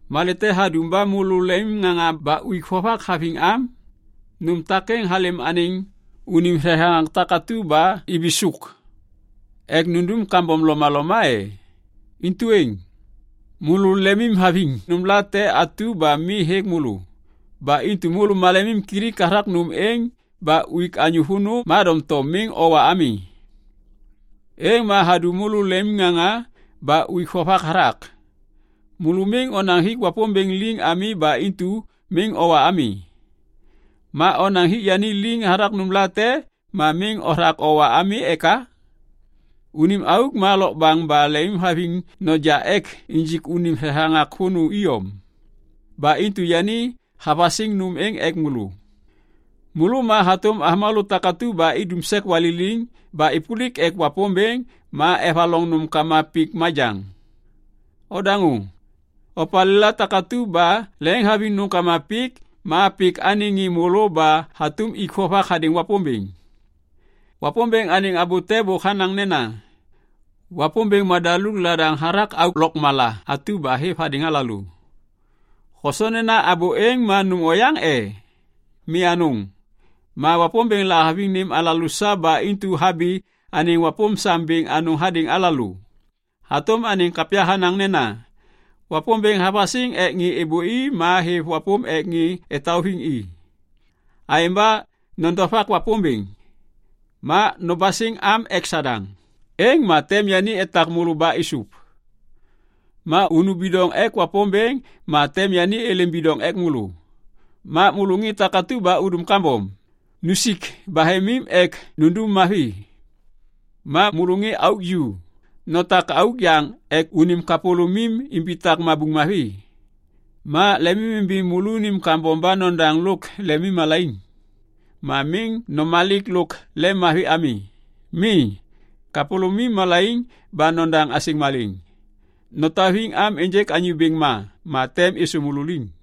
Malê te hadum ba môlô lemimŋaŋa ba uik vovak haviŋ am? Nôm takêŋ halêm anêŋ unim thethaŋak takatu ba ibisôk ek nundum kambom lomaloma e? Intu êŋ. Môlô lemimhaviŋ nômlate atu ba mi hêk môlô. Ba intu môlô malemimkilik hathak nôm êŋ ba uik anyô vônô ma doŋtom miŋ owa ami. Êŋ ma hadum môlô lemimŋaŋa ba uik vovak hathak. Môlô miŋ onaŋ hik Wapômbêŋ liŋ ami ba intu miŋ owa ami. Ma onaŋ hik yani liŋ hathak nômlate ma miŋ othak owa ami eka? Unim auk ma lokbaŋ ba lemimhaviŋ noja ek injik unim thethaŋak vônô iyom. Ba intu yani havasiŋ nôm êŋ ek môlô. Môlô ma hatôm avômalô takatu ba idum sek waliliŋ ba êpôlik ek Wapômbêŋ ma evaloŋ nômkama pik majaŋ. Odaŋô! Opalêla takatu ba leŋiŋhaviŋ nômkama pik ma pik anêŋ ŋê môlô ba hatôm ik vovak hadêŋ Wapômbêŋ. Wapômbêŋ anêŋ abô te bôk hanaŋ nena, “Wapômbêŋ madaluk ladaŋ hathak auk lôkmala atu ba hêv hadêŋ alalô.” Hosoŋ nena abô êŋ ma nôm oyaŋ e? Mi anôŋ! Ma Wapômbêŋ lahaviŋ nêm alalô sa ba intu habi anêŋ wapôm sam bêŋ anôŋ hadêŋ alalô. Hatôm anêŋ kapya hanaŋ nena, “Wapômbêŋ havasiŋ ek ŋê êbôi ma hêv wapôm ek ŋê etauviŋ i.” Aêŋ ba nodovak Wapômbêŋ. Ma nobasiŋ am ek Sadaŋ, êŋ ma tem yani etak môlô ba êsôv. Ma unu bidoŋ ek Wapômbêŋ ma tem yani êlêm bidoŋ ek môlô. Ma môlô ŋê takatu ba udum kambom, nusik bahemim ek nundum mavi. Ma môlô ŋê auk ju, notak auk yaŋ ek unim kapôlômim imbitak mabuŋ mavi. Ma lemimimbi môlônim kambom ba nodaŋ lôk lemimmalaiŋ. Ma miŋ nomalik lôk lemmavi ami. Mi, kapôlômim malaiŋ ba nodaŋ asêŋ malêŋ. Notauviŋ am ênjêk Anyô Bêŋ ma, ma tem êsô môlô liŋ.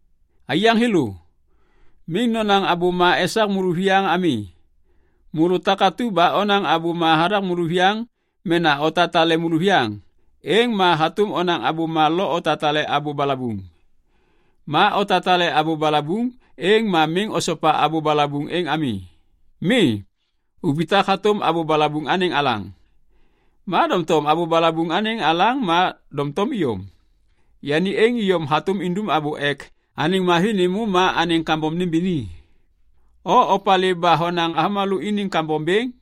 Aiyaŋ thêlô, miŋ nonaŋ abôma esak môlôviyaŋ ami. Môlô takatu ba onaŋ abôma hathak môlôviyaŋ mena otatale môlôviyaŋ, êŋ ma hatôm onaŋ abôma lo otatale abô balabuŋ. Ma otatale abô balabuŋ, êŋ ma miŋ osopa abô balabuŋ êŋ ami. Mi, ubitak hatôm abô balabuŋ anêŋ alaŋ. Ma doŋtom abô balabuŋ anêŋ alaŋ ma doŋtom iyom. Yani êŋ iyom hatôm indum abô ek anêŋ mavi nêmô ma anêŋ kambom nêmbini. O opalê ba honaŋ avômalô iniŋ kambom bêŋ?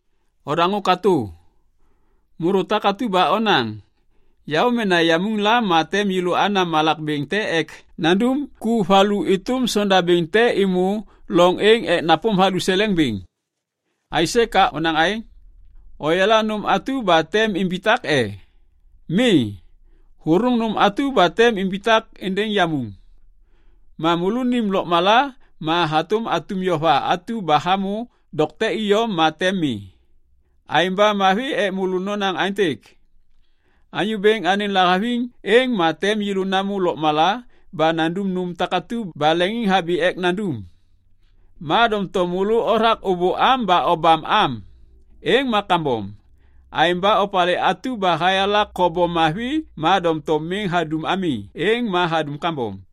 Odaŋô katô! Môlô takatu ba onaŋ, “Yaô mena yamuŋ la ma tem yêlô ana malak bêŋ te ek nandum ku valu êtôm sondabêŋ te êmô loŋ êŋ ek napôm valuseleŋ bêŋ.” Aisê ka onaŋ aêŋ? Oyala nôm atu ba tem imbitak e? Mi, ôthôŋ nôm atu ba tem imbitak êndêŋ yamuŋ! Ma môlônim lôkmala ma hatôm atum yova atu ba hamô dokte iyom ma tem mi. Aêŋ ba mavi ek môlô nonaŋ aêntêk, “Anyô Bêŋ anêŋ lahaviŋ, êŋ ma tem yêlô namô lôkmala ba nandum nôm takatu ba leŋiŋhabi ek nandum.” Ma doŋtom môlô othak ôbôam ba obam am. Êŋ ma kambom. Aêŋ ba opalê atu ba hayala kobom mavi ma doŋtom miŋ hadum ami, êŋ ma hadum kambom.